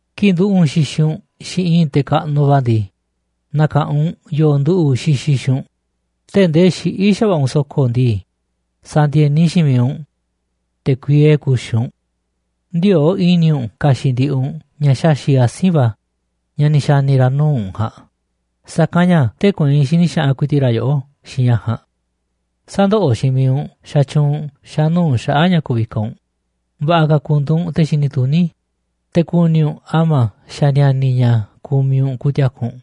Kii̱ꞌ nduꞌu̱ꞌ u̱nꞌ xixiꞌ u̱nꞌ xiinꞌ i̱i̱n te̱ kaꞌnuꞌ va̱ ndii, na̱ka̱ꞌanꞌ u̱nꞌ yoo nduꞌu̱ꞌ xixiꞌ xiinꞌ u̱nꞌ. Tee̱ꞌ ndee xiꞌí xa̱va̱ꞌa̱ u̱nꞌ so̱ko̱ ndii, sa̱ndi̱e̱ni xiinꞌ miiꞌ u̱nꞌ, te̱ kuiee ku̱xi̱ u̱nꞌ. Ndiöo̱ꞌ i̱ni̱ u̱nꞌ ka̱xi̱ꞌ ndiꞌiꞌ u̱nꞌ ña̱ xaxi̱ꞌ asi̱nꞌ va̱ ña̱ ni̱ xa̱ni̱ ra̱ nuu̱ꞌ u̱nꞌ ja̱a̱nꞌ, sa̱kanꞌ ña̱ tee̱ꞌ kueinꞌ xini xaꞌanꞌ ku̱i̱ti̱ꞌ ra̱ yoꞌó xiinꞌ ña̱ ja̱a̱nꞌ. Sä̱ndoꞌoꞌ xiinꞌ miiꞌ u̱nꞌ xatyuunꞌ u̱nꞌ xa̱nuu̱ꞌ xaꞌa̱ꞌ ña̱ ku̱vikaꞌ u̱nꞌ, va̱ꞌa̱ ka̱ ku̱ndu̱u̱ u̱nꞌ te̱ xini tuní, te̱ ku̱ni̱ u̱nꞌ a̱ma̱a̱ xa̱ ni̱a̱ni̱ ña̱ kumiꞌ u̱nꞌ ku̱ti̱a̱ku̱ u̱nꞌ.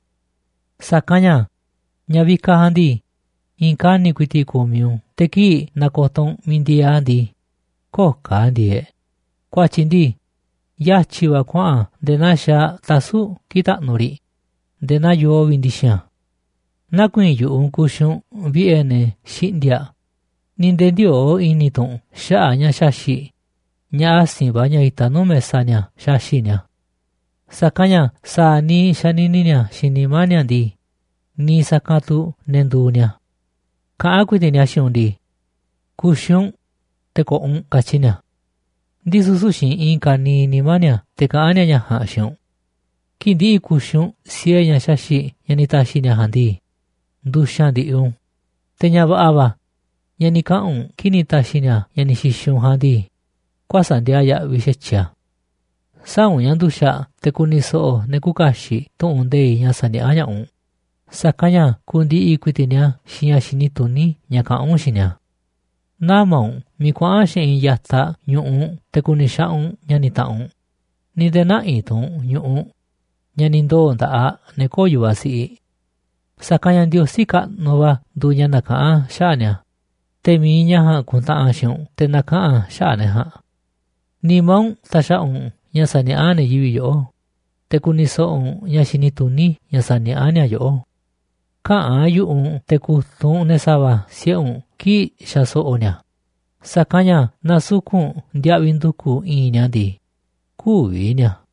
Sa̱kanꞌ ña̱ ña̱ vikaꞌ ja̱a̱nꞌ ndii, i̱i̱n kani̱ꞌ ku̱i̱ti̱ꞌ kumiꞌ u̱nꞌ te̱ kii̱ꞌ na̱ko̱to̱ u̱nꞌ miiꞌ ndieeꞌ a̱ ndii, köo̱ꞌ ka̱ a̱ ndieeꞌ, ku̱a̱tyi̱ ndii, yatyi̱ va̱ kuaꞌa̱n a̱ nde̱e̱ naa xaaꞌ tasu̱ꞌ kii̱ꞌ taꞌnuꞌ riꞌ nde̱e̱ naa yoo vi̱ꞌ ndi̱xi̱n a̱. Nä̱ku̱i̱i̱n yu̱ꞌuꞌ u̱nꞌ ku̱xi̱ u̱nꞌ vi̱ꞌe̱ ne̱ xiꞌndi̱a̱ꞌ, ni̱ nde̱e̱ ndiöo̱ꞌ i̱ni̱ tu̱ u̱nꞌ xaꞌa̱ꞌ ña̱ xaxi̱ꞌ ña̱ asi̱nꞌ va̱ ña̱ itaꞌ nuu̱ꞌ mesa ni̱a̱ xaxi̱ꞌ ni̱a̱. Sa̱kanꞌ ña̱ sa̱a̱ niiꞌ xanini ni̱a̱ xiinꞌ nimá ni̱a̱ ndii, niiꞌ sa̱kanꞌ tu̱ ne̱ nduuꞌ ni̱a̱. Kaꞌán ku̱i̱ti̱ꞌ ni̱a̱ xiinꞌ u̱nꞌ ndii: “Ku̱xi̱ u̱nꞌ, te̱ ko̱ꞌo̱ u̱nꞌ”, katyi ni̱a̱. Ndisu̱ süu̱ꞌ xiinꞌ i̱i̱n ka̱niiꞌ nimá ni̱a̱ te̱ kaꞌán ni̱a̱ ña̱ ja̱a̱nꞌ xiinꞌ u̱nꞌ. Kii̱ꞌ ndi̱ꞌi̱ ku̱xi̱ u̱nꞌ siee ña̱ ni̱ ta̱xi̱ ni̱a̱ ja̱a̱nꞌ ndii, ndu̱xa̱n ndi̱ꞌi̱ u̱nꞌ u̱n, te̱ ña̱ va̱ꞌa̱ va̱ ña̱ ni̱ kaꞌa̱n u̱nꞌ kii̱ꞌ ni̱ ta̱xi̱ ni̱a̱ ña̱ ni̱ xi̱xi̱ u̱nꞌ ja̱a̱nꞌ ndii, kuäsa̱ꞌ ndiaa yaꞌviꞌ xa̱tyiꞌ a̱. Sä̱a̱ u̱nꞌ ña̱ nduxa̱ꞌ te̱ ku̱ni̱ so̱ꞌo̱ ne̱ küuꞌ kaxiꞌ tu̱ꞌu̱n nde̱iꞌ ña̱ saniaꞌá ña̱ꞌaꞌ u̱nꞌ, sa̱kanꞌ ña̱ ku̱ndi̱ꞌi̱ ku̱i̱ti̱ꞌ ni̱a̱ xiinꞌ ña̱ xini tuní ña̱ kaꞌán u̱nꞌ xiinꞌ ni̱a̱. Nä̱ma̱ u̱nꞌ miiꞌ kuaꞌa̱n xeꞌinꞌ ya̱taꞌ ñu̱ꞌuꞌ u̱nꞌ te̱ ku̱ni̱ xaꞌanꞌ u̱nꞌ ña̱ni̱ taꞌanꞌ u̱nꞌ, ni̱ nde̱e̱ nä̱ꞌi̱ tu̱ u̱nꞌ ñu̱ꞌuꞌ ña̱ ni̱ ndoo̱ nda̱ꞌaꞌ ne̱ köo̱ꞌ yu̱vaꞌ siꞌiꞌ. Sa̱kanꞌ ña̱ Ndiosí kaꞌnuꞌ va̱ nduuꞌ ña̱ nakaꞌán xaꞌa̱ꞌ ni̱a̱, te̱ mi̱iꞌ ña̱ ja̱a̱nꞌ ku̱ntaꞌanꞌ xiinꞌ u̱nꞌ te̱ na̱kaꞌa̱n a̱ xaꞌa̱ꞌ ne̱ ja̱a̱nꞌ. Nimá u̱nꞌ ta̱xa̱ꞌa̱ u̱nꞌ ña̱ saniaꞌá ne̱ yivi̱ꞌ yoꞌó, te̱ ku̱ni̱ so̱ꞌo̱ u̱nꞌ ña̱ xini tuní ña̱ saniaꞌá ni̱a̱ yoꞌó. Käꞌa̱n yu̱ꞌuꞌ u̱nꞌ te̱ ku̱tunꞌ u̱nꞌ ne̱ sa̱va̱ siꞌe̱ u̱nꞌ kii̱ꞌ xaso̱ꞌo̱ ni̱a̱, sa̱kanꞌ ña̱ naaꞌ su̱ku̱ꞌ u̱nꞌ ndiaꞌviꞌ ndu̱ku̱ i̱i̱nꞌ ni̱a̱ ndii, kü̱vi̱ ni̱a̱.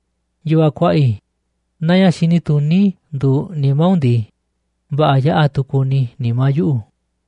Yu̱vaꞌ kuaꞌa i̱, naaꞌ ña̱ xini tuní nduuꞌ nimá u̱nꞌ ndii, va̱ꞌa̱ yaꞌa̱ tu̱ ku̱ni̱ nimá yuꞌu̱.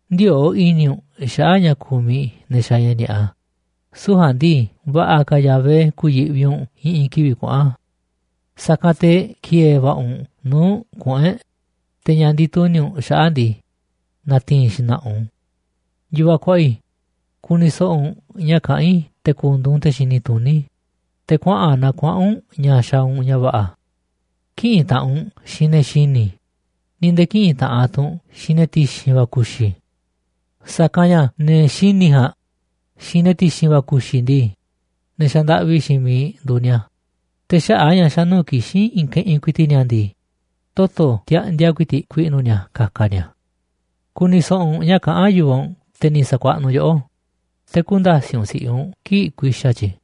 Ndiöo̱ꞌ i̱ni̱ u̱nꞌ xaꞌa̱ꞌ ña̱ kumiꞌ ne̱ xaaꞌ ña̱ ni̱a̱ꞌa, süu̱ꞌ ja̱a̱nꞌ ndii, va̱ꞌa̱ ka̱ Yahvé ku̱yi̱ꞌvi u̱nꞌ i̱ꞌi̱n kivi̱ꞌ kuaꞌa̱n. Sa̱kanꞌ te̱ ki̱e̱e̱ va̱ꞌa̱ u̱nꞌ nuu̱ꞌ kuꞌu̱n e̱ꞌ, te̱ ña̱ ndituni̱ u̱nꞌ xaꞌa̱ꞌ ndii, na̱ti̱i̱n xna̱ꞌa̱ u̱nꞌ u̱n. Yu̱vaꞌ kuaꞌa i̱, ku̱ni̱ so̱ꞌo̱ u̱nꞌ ña̱ kaꞌán i̱ te̱ ku̱ndu̱u̱ u̱nꞌ te̱ xini tuní, te̱ kuaꞌa̱n naa kuaꞌa̱n u̱nꞌ ña̱ xaaꞌ u̱nꞌ ña̱ va̱ꞌa̱. Kï̱ꞌi̱n taꞌanꞌ u̱nꞌ xiinꞌ ne̱ xini̱, ni̱ nde̱e̱ kï̱ꞌi̱n taꞌanꞌ tu̱ u̱nꞌ xiinꞌ ne̱ ti̱xi̱n va̱ ku̱xi̱. Sa̱kanꞌ ña̱ ne̱ xini̱ ja̱a̱nꞌ xiinꞌ ne̱ ti̱xi̱n va̱ ku̱xi̱ ndii, ne̱ xandaꞌvi xiinꞌ miiꞌ nduuꞌ ni̱a̱, te̱ xaꞌa̱ꞌ a̱ ña̱ xa̱ nuu̱ꞌ kixín i̱i̱n keꞌinꞌ ku̱i̱ti̱ꞌ ni̱a̱ ndii, toto̱ tiaꞌndia ku̱i̱ti̱ꞌ ku̱i̱ꞌnu̱ ni̱a̱ ka̱ka̱ ni̱a̱. Ku̱ni̱ so̱ꞌo̱ u̱nꞌ ña̱ kaꞌán yu̱vaꞌ u̱nꞌ, te̱ ni̱ sa̱kuaꞌnuꞌ yoꞌó, te̱ kü̱nda̱siꞌ u̱nꞌ si̱ꞌiꞌ u̱nꞌ kii̱ꞌ ku̱i̱xa̱ tyi̱.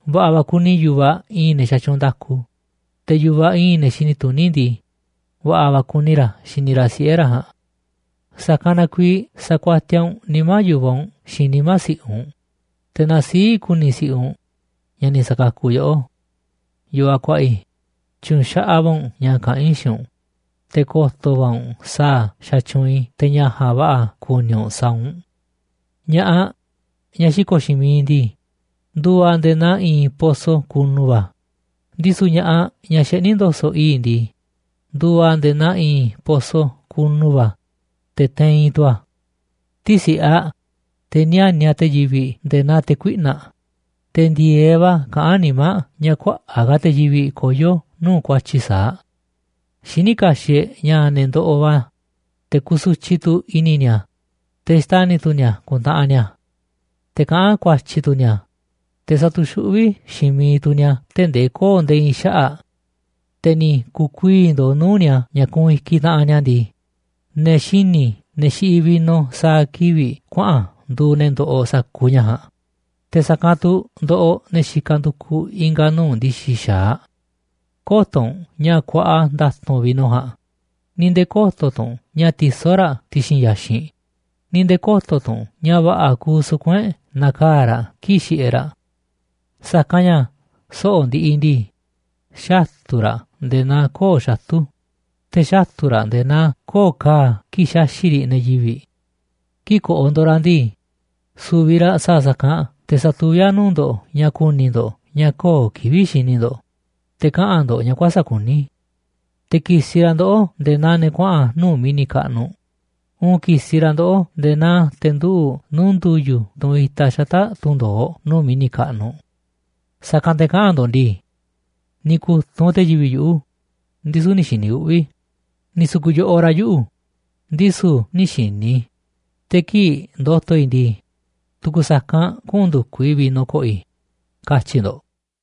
Va̱ꞌa̱ va̱ kuni yu̱vaꞌ i̱i̱n ne̱ xatyuunꞌ nda̱ku, te̱ yu̱vaꞌ i̱i̱n ne̱ xini tuní ndii, va̱ꞌa̱ va̱ kuni ra̱ xini ra̱ siꞌe̱ ra̱ ja̱a̱nꞌ. Sa̱kanꞌ na kuiiꞌ sa̱kuatiaꞌ u̱nꞌ nimá yu̱vaꞌ u̱nꞌ xiinꞌ nimá si̱ꞌiꞌ u̱nꞌ, te̱ na sii̱ꞌ ku̱ni̱ si̱ꞌiꞌ u̱nꞌ ñaꞌ ni̱ sa̱kakuꞌ yoꞌó. Yu̱vaꞌ kuaꞌa i̱, tyu̱nxaꞌaꞌ va̱ u̱nꞌ ña̱ kaꞌán i̱ xiinꞌ u̱nꞌ, te̱ ko̱to̱ va̱ u̱nꞌ sa̱a̱ xatyuunꞌ i̱ te̱ ña̱ ja̱a̱nꞌ va̱ꞌa̱ kuni u̱nꞌ sa̱a̱ u̱nꞌ. Ña̱ꞌaꞌ, ñaꞌ xiko̱ꞌ xiinꞌ miiꞌ ndii, nduuꞌ aꞌ nde̱e̱ naa i̱i̱n poso kunu va̱, ndisu̱ ña̱ꞌaꞌ, ñaꞌ xeꞌní ndo̱so̱ꞌ i̱i̱ꞌ ndii, nduuꞌ aꞌ nde̱e̱ naa i̱i̱n poso kunu va̱, te̱ teiinꞌ tu̱ a̱. Tisi̱ꞌe aꞌ, te̱ níániꞌ aꞌ te̱ yivi̱ꞌ nde̱e̱ naa te̱ kuiꞌna̱ꞌ, te̱ ndi̱e̱eꞌ va̱ kaꞌán nimá aꞌ ña̱ kuaꞌa̱ꞌ ka̱ te̱ yivi̱ꞌ koyó nuu̱ꞌ ku̱a̱tyi̱ sa̱a̱ aꞌ. Xiní kaxiꞌ e̱ꞌ ña̱ ne̱ ndoꞌoꞌ va̱, te̱ kusutyiꞌ tu̱ i̱ni̱ ni̱a̱, te̱ xtani̱ tu̱ ni̱a̱ ku̱ntaꞌanꞌ ni̱a̱, te̱ kaꞌán ku̱a̱tyi̱ tu̱ ni̱a̱, te̱ satuxuꞌví xiinꞌ miiꞌ tu̱ ni̱a̱ tee̱ꞌ ndee köo̱ꞌ nde̱e̱ i̱i̱n xaꞌa̱ꞌ, te̱ ni̱ ku̱u̱ kuii̱ꞌ ndo̱o̱ nuu̱ꞌ ni̱a̱ ña̱ kuunꞌ i̱kiꞌ taꞌanꞌ ni̱a̱ ndii, ne̱ xini̱, ne̱ xiꞌiꞌ vino sa̱a̱ kivi̱ꞌ kuaꞌa̱n nduuꞌ ne̱ ndoꞌoꞌ sa̱kuuꞌ ña̱ ja̱a̱nꞌ, te̱ sa̱kanꞌ tu̱ ndoꞌoꞌ ne̱ xikaꞌ ndukuꞌ i̱nga̱ nuu̱ꞌ ndi̱xi̱ xa̱aꞌ. Kö̱to̱ u̱nꞌ ña̱ kuaꞌa nda̱tu̱nꞌ vino ja̱a̱nꞌ, ni̱ nde̱e̱ kö̱to̱ tu̱ u̱nꞌ ña̱ tisó ra̱ ti̱xi̱n ya̱xinꞌ ni̱ nde̱e̱ kö̱to̱ tu̱ u̱nꞌ ña̱ va̱ꞌa̱ kuuꞌ suku̱nꞌ e̱ꞌ nakaa̱ꞌ raꞌ kii̱ꞌ xiꞌiꞌ e̱ꞌ ra̱. Sa̱kanꞌ ña̱ soꞌo̱ꞌ ndiꞌiꞌ ndii, xatu̱ raꞌ nde̱e̱ naa koo̱ꞌ xatu̱, te̱ xatu̱ raꞌ nde̱e̱ naa koo̱ꞌ ka̱a̱ kii̱ꞌ xaxi̱ꞌ riꞌ ne̱ yivi̱ꞌ. Kii̱ꞌ ko̱ꞌo̱ ndo̱ꞌ raꞌ ndii, su̱vi̱ raꞌ sa̱a̱ sa̱kanꞌ te̱ sa̱tuví a̱ nuu̱ꞌ ndo̱ꞌ ña̱ ku̱ni̱ ndo̱ꞌ ña̱ köo̱ꞌ kivi̱ꞌ xini ndo̱ꞌ, te̱ kaꞌa̱n ndo̱ꞌ ña̱ kuäsa̱ꞌ kuní. Te̱ ki̱si̱ raꞌ ndoꞌó nde̱e̱ naa ne̱ kuaꞌa̱n nuu̱ꞌ mi̱ni̱ kaꞌnuꞌ, uun ki̱si̱ raꞌ ndoꞌó nde̱e̱ naa te̱ nduꞌu̱ꞌ nuu̱ꞌ ndu̱yu̱, tunꞌ itaꞌ xata̱ꞌ tunꞌ ndo̱oꞌ nuu̱ꞌ mi̱ni̱ kaꞌnuꞌ. Sa̱kanꞌ te̱ kaꞌa̱n ndo̱ꞌ ndii: “Ni̱ ku̱tunꞌ te̱ yivi̱ꞌ yuꞌu̱, ndisu̱ nï̱ xi̱ni̱ uꞌvi̱ i̱, ni̱ su̱ku̱ꞌ yo̱ꞌoꞌ ra̱ yuꞌu̱, ndisu̱ nï̱ xi̱ni̱ i̱, te̱ kii̱ꞌ ndo̱to̱ i̱ ndii, tu̱ku̱ sa̱kanꞌ kuꞌu̱n ndu̱kuꞌ i̱ vino ko̱ꞌo̱ i̱”, katyi̱ ndo̱ꞌ.